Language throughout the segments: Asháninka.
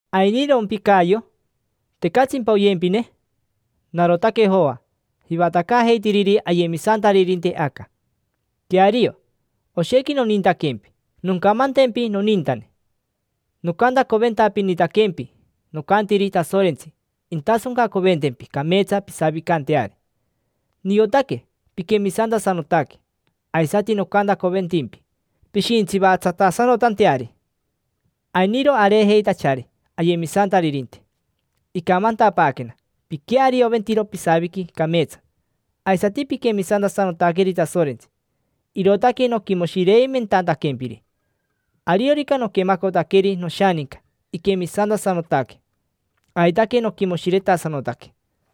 ¿Ainirompi Cayo? ¿Tecatsimpa oyempine? Narotaque Joa, jivatacaajeitiriri ayemisantaririnte aca. Queario, oshequi nonintaquempi. Noncamantempi, nonintane, nocantacoventapinitaquempi: nocantiri Tasorentsi intasoncacoventempi cameetsa pisavicanteari. Niotaque piquemisantasanotaque, aisati nocantacoventimpi pishintsivatsatasanotanteari. Ainiro areejeitachari ayemisantaririnte, icamantapaaquena piquearioventiro pisaviqui cameetsa, aisati piquemisantasanotaqueri Tasorentsi, irootaque noquimoshireimentantaquempiri. Ariorica noquemacotaqueri noshaninca iquemisantasanotaque, aitaque noquimoshiretasanotaque.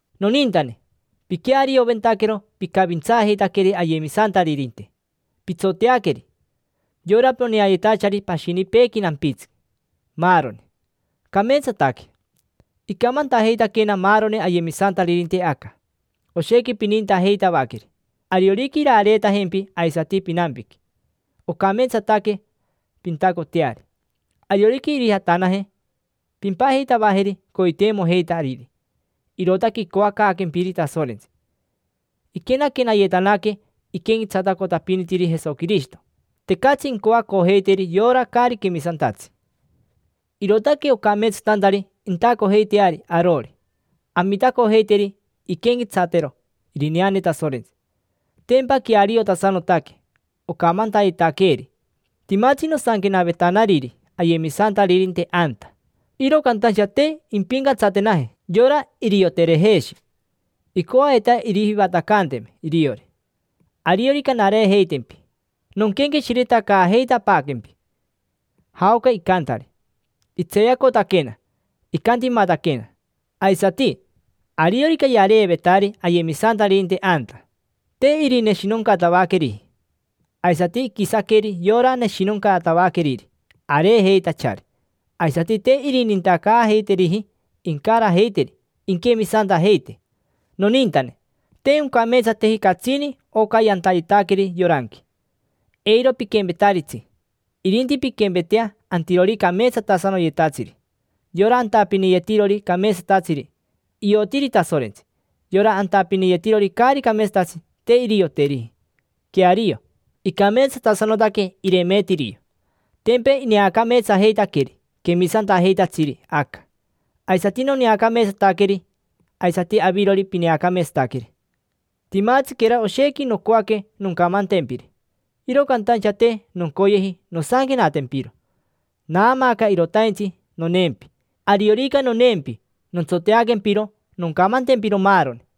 Nonintane, piquearioventaquero picavintsaajeitaqueri ayemisantaririnte, pitsoteaqueri: yora poneayetachari pashinipeequi nampitsi, maaroni. Cameetsataque. Icamantajeitaquena maaroni ayemisantaririnte aca, oshequi pinintajeitavaqueri. Ariorica irareetajempi aisati pinampiqui, ocameetsataque pintacoteari; ariorica irijatanaje, pimpajeitavajeri coiteimojeitariri: irootaque icoacaaquempiri Tasorentsi. Iquenaquenayetanaque iquenquetsatacotapinitiri Jesoquirishito, tecatsi incoacojeiteri yora caari quemisantatsi, irootaque ocameetsatantari intacojeiteari arori, amitacojeiteri inquenquetsatero irineane Tasorentsi: tempa queariotasanotaque ocamantayetaqueeri. Timatsi nosanquenavetanariri ayemisantaririnte anta, iro cantaincha te impincatsatenaji yora Irioterejeshi. Icoaveta irijivatacanteme iriori. Ariorica nareejeitempi nonquenqueshiretacaajeitapaaquempi jaoca icantari: itseeyacotaquena, icantimataquena. Aisati, ariorica yareevetari ayemisantaririnte anta, te irineshinoncatavaqueriji. Aisati iquisaqueri yora neshinoncatavaqueriri areejeitachari, aisati te irinintacaajeiteriji incarajeiteri inquemisantajeite. Nonintane, te oncameetsateji catsini oca yantayetaqueri yoranqui: eiro piquempetaritsi. Irinti pinquempetea antirori cameetsatasanoyetatsiri. Yora antapiniyetirori cameetsatatsiri, iotiri Tasorentsi; yora antapiniyetirori caari cameetsatatsi, te irioteriji. Queario, icameetsatasanotaque Irimitirio. Tempa ineacameetsajeitaqueri quemisantajeitatsiri aca, aisati noneacameetsataqueri, aisati avirori pineacameetsataqueri. Timatsiquera oshequi nocoaque noncamantempiri, iro cantaincha te noncoyeji nosanquenatempiro. Naamaaca irotaintsi noneempi: ariorica aneavacayea nontsoteaquempiro, noncamantempiro maaroni.